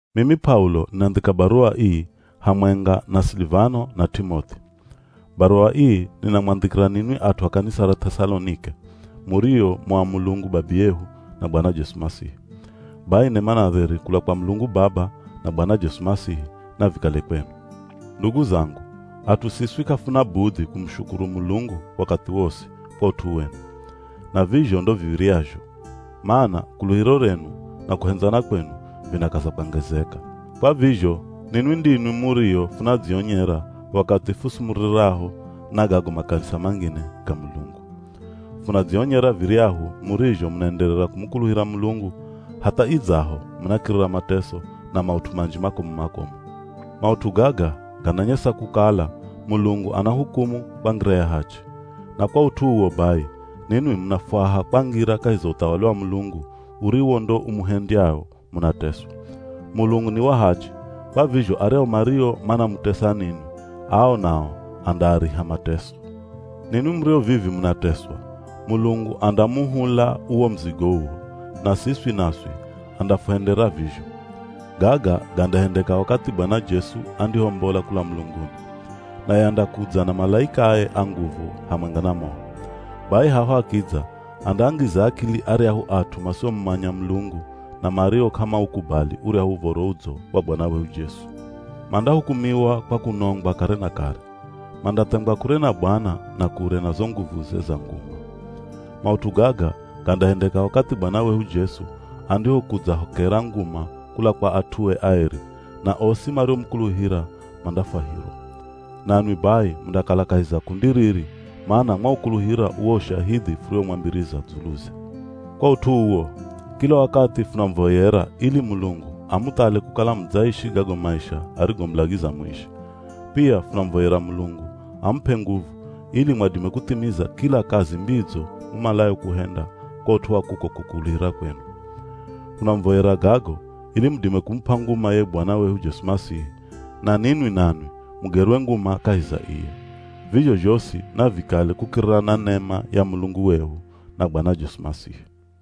Mimi P'aulo ninandhika baruwa ii hamwenga na Silivano, na T'imoth'i. Baruwa ii, ninamwandhikira ninwi at'u a kanisa ra Th'esalonike, murio mu a Mulungu Babiyehu na Bwana Jesu Masihi. Bai nema na dheri kula kwa Mulungu Baba na Bwana Jesu Masihi, navikale kwenu. Ndugu zangu, at'u siswi k'afuna budhi kumushukuru Mulungu wakathi wosi kwa ut'u wenu. Na vizho ndo viv̱iryazho, mana kuluhiro renu, na kuhendzana kwenu vinakaza kwangezeka. Kwa vizho ninwi ndinwi murio funadzionyera wakathi fusumuriraho na gago makanisa mangine ga Mulungu. Funadzionyera viryahu murizho munaenderera kumukuluhira Mulungu, hatha idzaho munakirira mateso na maut'u manji makomu-makomu. Maut'u gaga gananyesa kukala Mulungu anahukumu kwa ngira ya hachi. Na kwa ut'u uwo bai ninwi munafwaha kwangira kahi za uthawali wa Mulungu uriwo ndo umuhendyao munateswa. Mulungu ni wa hachi, kwa vizho aryahu mario manamutesa ninwi, ao nao andaariha mateso. Ninwi murio vivi munateswa, Mulungu andamuhula uwo muzigo uwo, na siswi naswi andafuhendera vizho. Gaga gandahendeka wakathi Bwana Jesu andihombola kula mulunguni. Naye andakudza na malaikae a nguvu hamwenga na moho. Bai haho akidza andaangiza akili aryahu at'u masiomumanya Mulungu na mario k'amaukubali uryahu Uv̱oro Udzo wa Bwana wehu Jesu. Mandahukumiwa kwa kunongwa kare na kare. Mandathengwa kure na Bwana na kure na zo nguvuze za nguma. Maut'u gaga gandahendeka wakathi Bwana wehu Jesu andihokudzahokera nguma kula kwa at'ue aeri, na osi mariomukuluhira mandafwahirwa. Nanwi bai mundakala kahi za kundi riri mana mwaukuluhira uwo ushahidhi furiwomwambiriza dzuluze. Kwa ut'u uwo, kila wakathi funamuvoyera ili Mulungu amuthale kukala mudzaishi gago maisha arigomulagiza muishi. Pia funamuvoyera Mulungu amup'e nguvu ili mwadime kuthimiza kila kazi mbidzo mumalayo kuhenda kwa ut'u wa kuko kukuluhira kwenu. Hunamuvoyera gago, ili mudime kumup'a nguma ye Bwana wehu Jesu Masihi, na ninwi nanwi mugerwe nguma kahi za iye. Vizho zhosi navikale kukirira na nema ya Mulungu wehu na Bwana Jesu Masihi.